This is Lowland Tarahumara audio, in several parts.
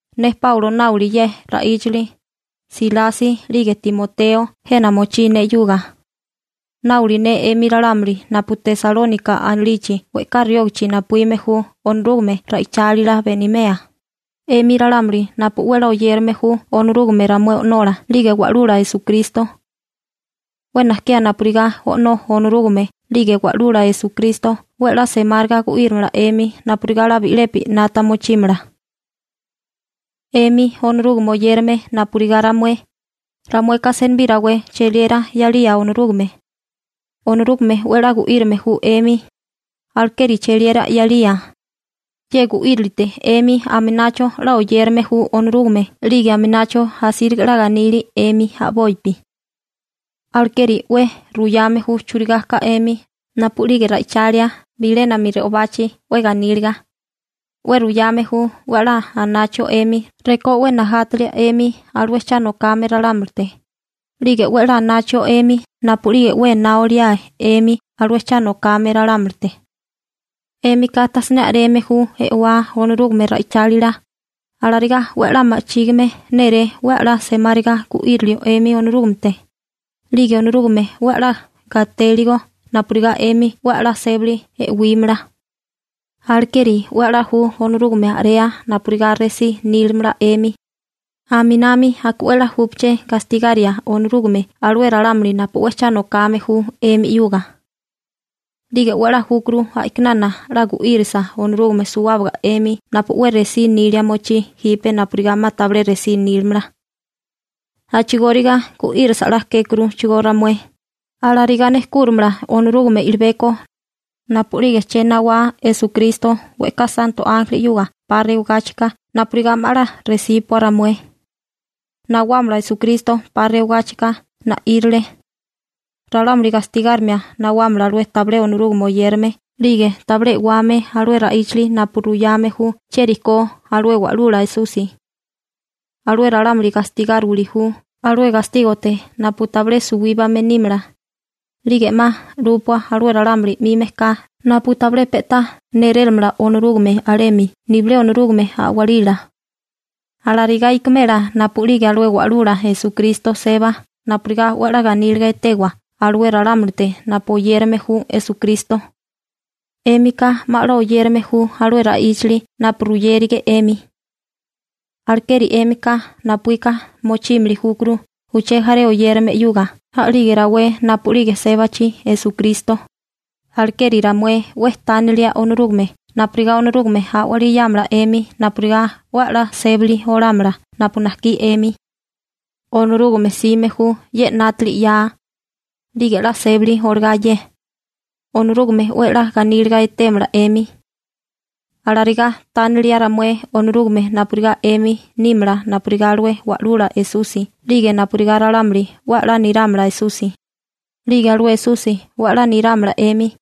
Ne Páulo náoli ye ra'íchali, Silasi 'lige Timoteo jena mochí ne 'yuga. Náoli ne 'emi ralámuli napu Tesalónika anilichi we'ká riógachi napuíme ju Onorúgame ra'ichálila benimea, 'emi ralámuli napu 'we 'la oyérame ju Onorúgame ramué O'nola 'lige Wa'lula Esukristo. 'We najkiá napurigá O'nó Onorúgame 'lige Wa'lula Esukristo 'we 'la semáriga gu'írimala 'emi napurigá 'la bi'lepi 'nata mochímala. 'Emi Onorúgame oyérame napurigá ramué, ramueka senibí rawé cheliera 'yalía Onorúgame. Onorúgame 'we 'la gu'írame ju 'emi, alekeri cheliera 'yalía. Ye gu'írilite 'emi aminacho 'la oyérame ju Onorúgame, 'lige aminacho asíriga 'la ganili 'emi a'bopi. Alekeri 'we ruyame ju churigá ka 'emi napu'lige ra'ichalia bilénami re'obachi 'we ganíliga. 'We ruyame ju 'we 'la anachio 'emi rekó 'we najátalia 'emi alué cha nokame ralámulite, 'lige 'we 'la anachio 'emi napu'lige 'we ená oliae 'emi alué cha nokame ralámulite. 'Émika tajsiné a'reme ju e'wá Onorúgame ra'ichálila. Alarigá 'we 'la ma'chígime néré 'we 'la semáriga gu'írilio 'emi Onorúgamete, 'lige Onorúgame 'we a'lá gatéligo napurigá 'emi 'we a'lá sébali e'wímala. Alekeri 'we a'lá ju Onorúgame a'rea napurigá resí nílimala 'emi. Aminami aka 'we 'la júpaché gastigaria Onorúgame alué ralámuli napu 'we cha nokame ju 'emi 'yuga. 'Lige 'we 'la júkuru a'kinana 'la gu'írisa Onorúgame suwábaga 'emi napu 'we resí nilia mochí jipe napurigá 'ma 'la tabilé resí nílamala. A'chigóriga gu'írisa 'la kékuruchigó ramué. Alarigá nejkúrimala Onorúgame i'libeko napu'lige uché nawá Esukristo we'ká santo ánjeli 'yuga 'pa rewagáchika napurigá 'ma 'la resíbopua ramué. Nawámala Esukristo 'pa rewagáchika na'írale. Ralámuli gastigárimia nawámala alué tabilé Onorúgame oyérame, 'lige tabilé e'wame alué ra'íchali napu ruyame ju chieri ko alué Wa'lula Esusi. Alué ralámuli gastigáriwili ju alué gastígote napu tabilé suwíbame nímala, 'lige 'ma 'lúpua alué ralámuli 'mi mejká napu tabilé pe'tá nérélamala Onorúgame alemi nibilé Onorúgame a'walila. Alarigá ikimela napu'lige alué Wa'lula Esukristo seba napurigá 'we 'la ganíliga etewa alué ralámulite napu oyérame ju Esukristo. 'Émika 'ma 'la oyérame ju alué ra'íchali napu ruyérige 'emi. Alekeri 'émika napuíka mochímili júkuru uché jaré oyérame 'yuga a'lige rawé napu'lige sébachi Esukristo. Alekeri ramué 'we tánilia Onorúgame napurigá Onorúgame a'walí 'yámala 'emi napurigá 'we a'lá sébali olámala napu najkí 'emi. Onorúgame 'sime ju ye 'nátili 'ya, 'lige 'la sébali olagá ye, Onorúgame 'we a'lá ganíliga etémala 'emi. Alarigá tánili ramué Onorúgame napurigá 'emi nímala napurigá alué Wa'lula Esusi 'lige napurigá ralámuli 'we a'lá nirámala Esusi, 'lige alué Esusi 'we a'lá nirámala 'emi.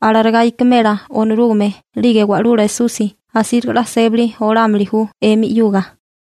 Alarigá ikimela Onorúgame 'lige Wa'lula Esusi asíriga 'la sébali olámili ju 'emi 'yuga.